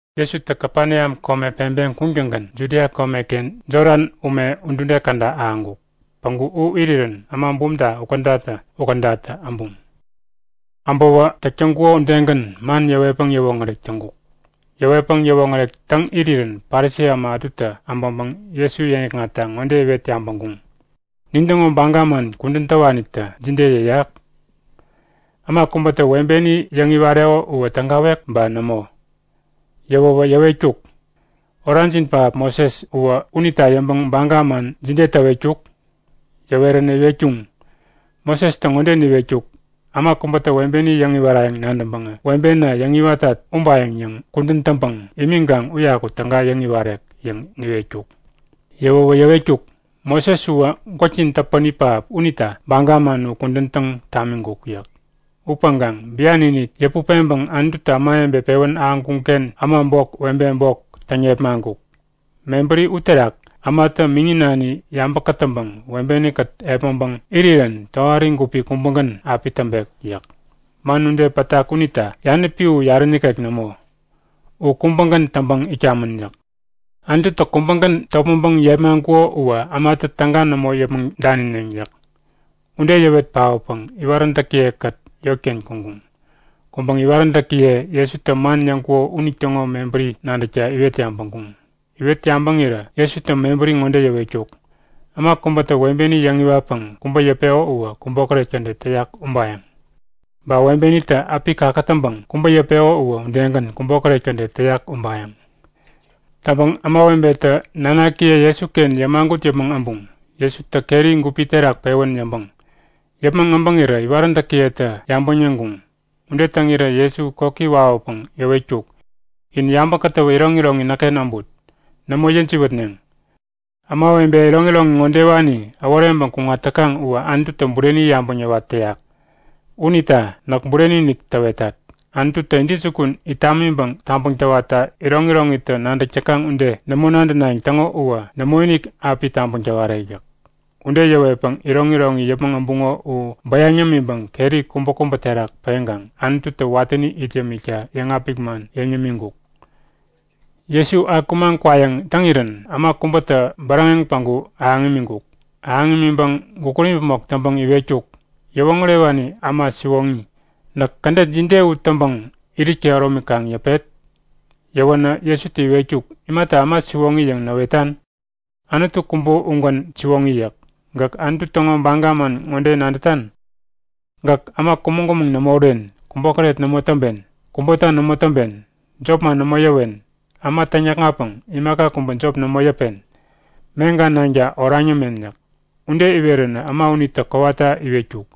Jesutä Kapeneam kome peŋpeŋ kuŋtäŋgän Judia komeken Jodan ume udude käda ahäŋkuk. Päŋku u irirän äma bumta ukädatä-ukädatä äbuŋ. Äbäwä täk täŋkuko udegän man yäwetpäŋ yäwoŋärek täŋkuk. Yäwetpäŋ yäwoŋärek täŋ irirän Parisi äma ätutä äbäŋpäŋ Jesu yäŋikŋatta ŋode iwet yabäŋkuŋ; Nintäŋo baga man kudän täwanitä jide yäyak? Äma kubätä webeni yäŋiwareko uwä tägawek ba nämo? Yäwäwä yäwetkuk; Orajin pähap Moses uwä unita yäŋpäŋ baga man jide täwetkuk? Yäweränä iwetkuŋ; Mosestä ŋode niwetkuk; Äma kubätä webeni yäŋiwarayäŋ nadäŋpäŋä webena yäŋiwatat ubayäŋ yäŋ kudän täŋpäŋ imiŋkaŋ uyaku täga yäŋ-iwarek yäŋ niwetkuk. Yäwäwä yäwetkuk; Moses uwä gwäkjin täpäni pähap unita baga man u kudän täŋ tamiŋkuk yäk. Upäŋkaŋ bian-inik yäput peŋpäŋ Anututä ämawebe pewän ahäŋkuŋ-ken äma bok, webe bok täŋ yepmaŋkuk. Mebäri uterak ämatä miŋi nani yabä kätäŋpäŋ webeni-kät epmäŋpäŋ irirän tohari gupi kubägän api täŋpek yäk. Man ude pätak unita yanäpi u yarä nikek nämo. U kubägän täŋpäŋ itkamän yäk. Anututä kubägän topmäŋpäŋ yepmaŋkuko uwä ämatä täga nämo yäpmäŋ danineŋ yäk. Ude yäwet paotpäŋ iwaräntäkiye-kät yotken kuŋkuŋ. Kuŋpäŋ iwaräntäkiye Jesutä man yäŋkuko unitäŋo mebäri nadäkta iwet yabäŋkuŋ. Iwet yabäŋirä Jesutä mebäri ŋode yäwetkuk; Äma kubätä webeni yäŋiwatpäŋ kubä yäpeko uwä kubokäret kädet täyak ubayäŋ. Ba webenitä äpi kakätäŋpäŋ kubä yäpeko uwä udegän kubokäret kädet täyak ubayäŋ. Täŋpäŋ ämawebetä nanakiye Jesuken yämagut yäpmäŋ äbuŋ, Jesutä keri gupi terak pewän yäŋpäŋ. Yäpmäŋ äbäŋirä iwaräntäkiyetä yabäŋ yäŋkuŋ. Ude täŋirä Jesu koki wawäpäŋ yäwetkuk; In yabä kätäwä iroŋiroŋi näkken äbut. Nämo yäjiwätneŋ. Ämawebe iroŋiroŋi ŋodewani äworeŋpäŋ kuŋat täkaŋ uwä Anututä bureni yabäŋ yäwat täyak. Unita näk bureni-inik täwetat; Anututä intäjukun it tamiŋpäŋ tabäŋ täwatta iroŋiroŋitä nadäk täkaŋ ude nämo nadänayäŋ täŋo uwä nämoinik api tabäŋ täwarek yäk. Ude yäwetpäŋ iroŋiroŋi yäpmäŋ äbuŋo u bäyaŋ yämiŋpäŋ keri kubäkubä terak peŋkaŋ Anututä watäni it yämikta yäŋapik man yäŋ yämiŋkuk. Jesu akumaŋ kwayäŋ täŋirän äma kubätä bäräŋeŋ päŋku ahäŋ imiŋkuk. Ahäŋ imiŋpäŋ gukut imäpmok täŋpäŋ iwetkuk; Yäwoŋärewani äma siwoŋi, näk kädet jide u iwatpäŋ irit kehäromi kaŋ yäpet? Yäwänä Jesutä iwetkuk; Imata äma siwoŋi yäŋ näwetan? Anutu kubä ugän siwoŋi yäk. Gäk Anutu täŋo baga man ŋode nadätan; Gäk äma kumäŋ-kumäŋ nämo uren, kubokäret nämo täŋpen, kubota nämo täŋpen, jopman nämo yäwen, äma täŋyäkŋatpäŋ imaka kubä jop nämo yäpen, meŋka nanka oraŋ yämen yäk. Ude iweränä äma unitä kowata iwetkuk;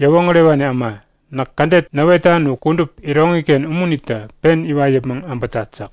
Yäwoŋärewani äma, näk kädet näwetan u kudup iroŋiken umunitä pen iwat yäpmäŋ äbätat yäk.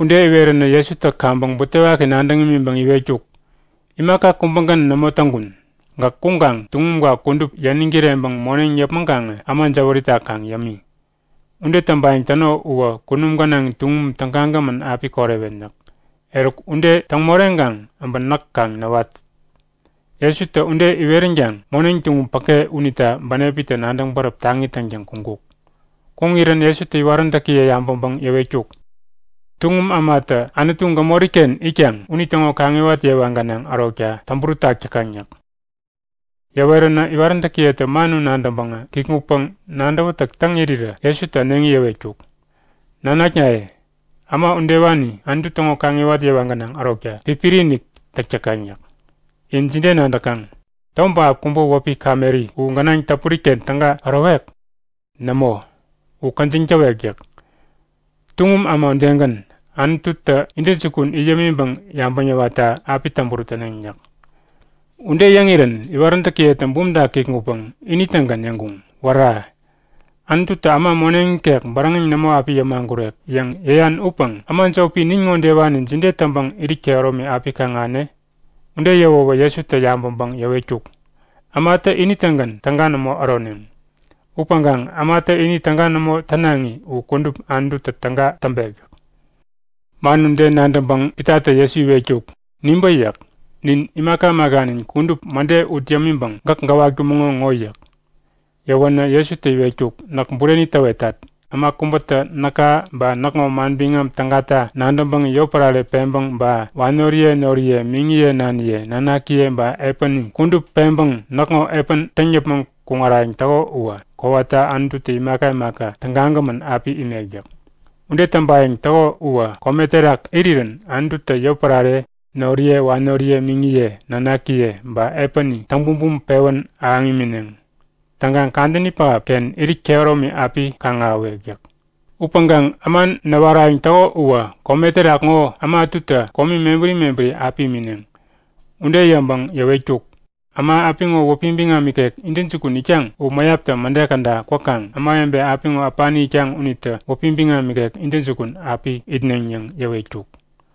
Ude iwerirän Jesutä kaŋpäŋ butewaki nadäŋ imiŋpäŋ iwetkuk; Imaka kubägän nämo täŋkun. Gäk kuŋkaŋ tuŋumka kudup yäniŋ kireŋpäŋ moneŋ yäpmäŋkaŋä äma jäwärita kaŋ yämi. Ude täŋpayäŋ täno uwä kunum gänaŋ tuŋum tägagämän api korewen yäk. Eruk ude täŋ moreŋkaŋ äbä näk kaŋ näwat! Jesutä ude iweränkaŋ moneŋ tuŋum päke unita bänepitä nadäŋ bäräp taŋi täŋtäŋ kuŋkuk. Kuŋirän Jesutä iwaräntäkiye yabäŋpäŋ yäwetkuk; Tuŋum ämatä Anutu gämori-ken itkaŋ unitäŋo kaŋiwat yewa gänaŋ ärokta täŋburut täk täkaŋ yäk. Yäweränä iwaräntäkiyetä man u nadäŋpäŋä kikŋutpäŋ nadäwätäk täŋ irirä Jesutä äneŋi yäwetkuk; Nanaknaye, äma udewani Anutu täŋo kaŋiwat yewa gänaŋ ärokta pipiri-inik täk täkaŋ yäk. In jide nadäkaŋ? Tom pähap kubä wäpi kameri u gänaŋ täpuri-ken täga ärowek? Nämo, u käjiŋ täwek yäk. Tuŋum äma udegän, Anututä intäjukun it yämiŋpäŋ yabäŋ yäwatta api täŋburut täneŋ yäk. Ude yäŋirän iwaräntäkiyetä bumta kikŋutpäŋ ini-tägän yäŋkuŋ; Wära! Anututä äma moneŋ ikek bäräŋeŋ nämo api yämagurek yäŋ yäyan upäŋ äma jopi nin ŋodewani jide täŋpäŋ irit kehäromi api kaŋ-ahäne? Ude yäwäwä Jesutä yabäŋpäŋ yäwetkuk; Ämatä ini-tägän täga nämo äroneŋ. Upäŋkaŋ ämatä ini täga nämo tänaŋi u kudup Anututä täga täŋpek yäk. Man ude nadäŋpäŋ Pitatä Jesu iwetkuk; Nibä yäk. Nin imaka imakanin kudup mäde ut yämiŋpäŋ gäk gäwatkumäŋo ŋo yäk. Yäwänä Jesutä iwetkuk; Näk bureni täwetat. Äma kubätä näka ba näkŋo Manbiŋam Tägata nadäŋpäŋ yotpärare peŋpäŋ ba wanoriye noriye, miŋiye naniye, nanakiye ba epäni kudup peŋpäŋ näkŋo epän täŋ yäpmäŋ kuŋarayäŋ täko uwä kowata Anututä imaka imaka tägagämän api imek yäk. Ude täŋpayäŋ täko uwä kome terak irirän Anututä yotpärare, noriye wanoriye, miŋiye nanakiye ba epäni täŋ bumbum pewän ahäŋ imineŋ. Täŋkaŋ kadäni pähapken irit kehäromi api kaŋ-ahäwek yäk. Upäŋkaŋ äma näwarayäŋ täko uwä kome terak ŋo äma ätutä komi mebäri mebäri api imineŋ. Ude yäŋpäŋ yäwetkuk; Äma apiŋo wäpi biŋam ikek intäjukun itkaŋ u mäyaptä mäde käda kwäkaŋ ämawebe apiŋo äpani itkaŋ unitä wäpi biŋam ikek intäjukun api itneŋ yäŋ yäwetkuk.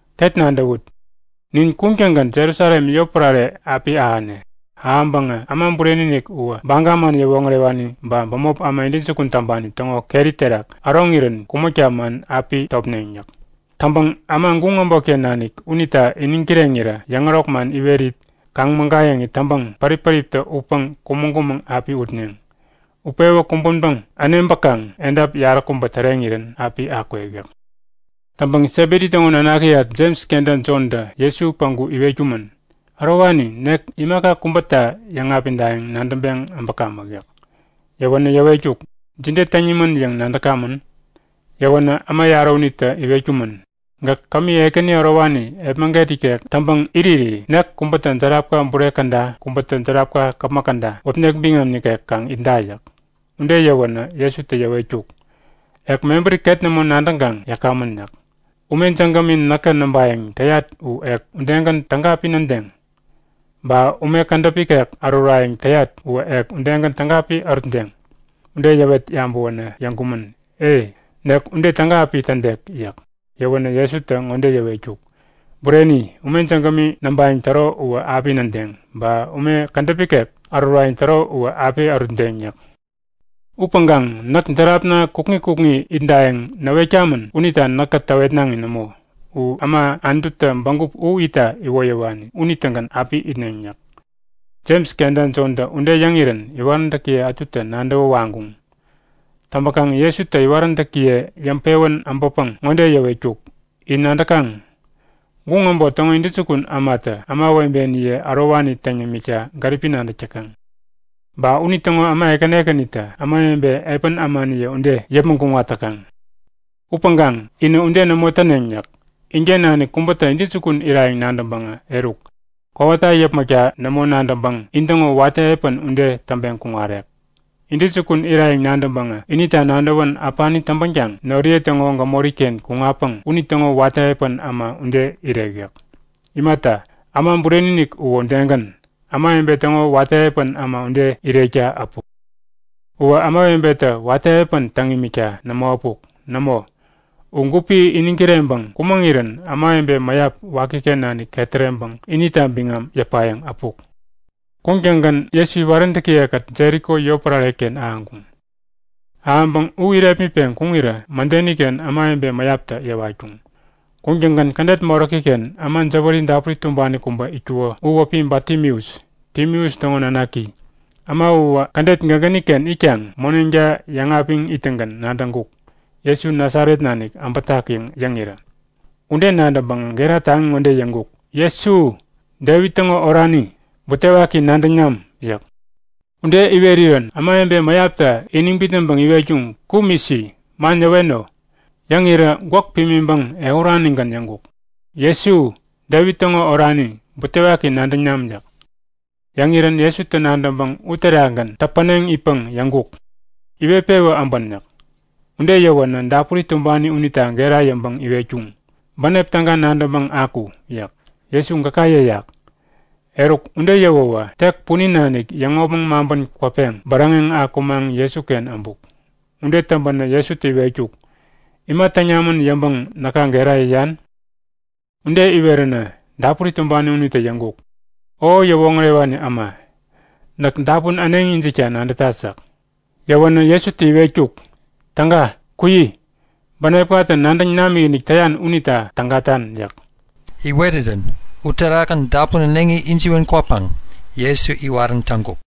Ket nadäwut! Nin kuŋtäŋgän Jerusalem yotpärare api ahäne. Ahäŋpäŋä Äma Bureni-inik uwä Baga man yäwoŋärewani ba bämop äma intäjukun täŋpani täŋo keri terak äroŋirän kumäkta man api topneŋ yäk. Täŋpäŋ äma guŋ äbotken nanik unita iniŋ kireŋirä yäŋärok man iwerit, kaŋ-mägayäŋit täŋpäŋ pärip-päriptä utpäŋ kumäŋ-kumäŋ api utneŋ. Utpewä kumbänpäŋ äneŋpäkaŋ edap yaräkubä täreŋirän api akwek yäk. Täŋpäŋ Sebedi täŋo nanakiyat Jems kenta Jontä Jesu päŋku iwetkumän; Ärowani, nek imaka kubäta yäŋapidayäŋ nadäŋpeŋ äbäkamäk yäk. Yäwänä yäwetkuk; Jide täŋ nimän yäŋ nadäkamän? Yäwänä äma yarä unitä iwetkumän; Gäk kämi ekäni ärowani epmäget ikek täŋpäŋ iriri nek kubätä järapka bure käda kubätä järapka käpmäk käda wäpnek biŋam nikek kaŋ itda yäk. Ude yäwänä Jesutä yäwetkuk; Ek mebäri ket nämo nadäŋkaŋ yäkamän yäk. Ume jägämi näkä näŋpayäŋ täyat u ek udegän täga api nädeŋ? Ba ume kädäp ikek ärurayäŋ täyat uwä ek udegän täga api ärutdeŋ? Ude yäwet yabäwänä yäŋkumän; E, nek ude täga api tädek yäk. Yäwänä Jesutä ŋode yäwetkuk; Bureni, ume jägämi näŋpayäŋ täro uwä api nädeŋ. Ba ume kädäp ikek ärurayäŋ täro uwä api ärutdeŋ yäk. Upäŋkaŋ näk järapna kukŋi kukŋi itdayäŋ näwetkamän unita näkä täwetnaŋi nämo. U äma Anututä bägup u itta iwoyäwani unitägän api itneŋ yäk. Jems kenta Jontä ude yäŋirän iwaräntäkiye ätutä nadäwä waŋkuŋ. Täŋpäkaŋ Jesutä iwaräntäkiye yäŋpewän äbäpäŋ ŋode yäwetkuk; In nadäkaŋ? Guŋ äbot täŋo intäjukun ämatä ämawebeniye ärowani täŋ yämikta gäripi nadäk täkaŋ. Ba unitäŋo äma ekäni ekänitä ämawebe epän ämaniye ude yäpmäŋ kuŋat täkaŋ. Upäŋkaŋ inä ude nämo täneŋ yäk. Inken nanik kubätä intäjukun irayäŋ nadäŋpäŋä eruk, kowata yäpmäkta nämo nadäŋpäŋ intäŋo watä epän ude täŋpeŋ kuŋarek. Intäjukun irayäŋ nadäŋpäŋä inita nadäwän äpani täŋpänkaŋ noriye täŋo gämori-ken kuŋatpäŋ unitäŋo watä epän äma ude irek yäk. Imata, Äma Bureni-inik uwä udegän, ämawebe täŋo watä epän äma ude irekta äpuk. Uwä ämawebetä watä epän täŋ imikta nämo äpuk. Nämo! U gupi iniŋ kireŋpäŋ kumäŋirän ämawebe mäyap wakiken nanik ketäreŋpäŋ inita biŋam yäpayäŋ äpuk. Kuŋtäŋgän Jesu iwaräntäkiye-kät Jeriko yotpärare-ken ahäŋkuŋ. Ahäŋpäŋ u irepmitpeŋ kuŋirä mädeni-ken ämawebe mäyaptä yäwatkuŋ. Kuŋtäŋgän kädet moräki-ken äma jäwäri dapuri tumbani kubä itkuko u wäpi Batimeus, Timeus täŋo nanaki. Äma uwä kädet gägäni-ken itkaŋ moneŋta yäŋapiŋ ittäŋgän nadäŋkuk; Jesu Nasaret nanik äbätak yäŋ yäŋirä. Ude nadäŋpäŋä gera taŋi ŋode yäŋkuk; Jesu, Devit täŋo orani, butewaki nadäŋ nam! yäk. Ude iwerirän ämawebe mäyaptä iniŋ bitnäŋpäŋ iwetkuŋ; Kum isi. Man yäweno! Yäŋirä gwäk pimiŋpäŋ ehuranigän yäŋkuk; Jesu, Devit täŋo orani, butewaki nadäŋ nam! yäk. Yäŋirän Jesutä nadäŋpäŋ uterakgän täpäneŋ itpäŋ yäŋkuk; Iwet-pewä äbän! yäk. Ude yäwänä dapuri tumbani unita gera yäŋpäŋ iwetkuŋ; Bänep täga nadäŋpäŋ aku! yäk. Jesu gäka yäyak! Eruk, ude yäwäwä tek punin nanik yäŋopmäŋ maŋpän kwäpeŋ bäräŋeŋ akumaŋ Jesuken äbuk. Ude täŋpänä Jesutä iwetkuk; Ima täŋ namän yäŋpäŋ näka gera yäyan? Ude iweränä dapuri tumbani unitä yäŋkuk; O Yäwoŋärewani äma, näk dapun äneŋi ijikta nadätat yäk. Yäwänä Jesutä iwetkuk; Täga, kuyi! Bänepkatä nadäŋ namikinik täyan unita tägatan yäk. Iwerirän uterakgän dapun äneŋi ijiwän kwäpäŋ Jesu iwarän täŋkuk.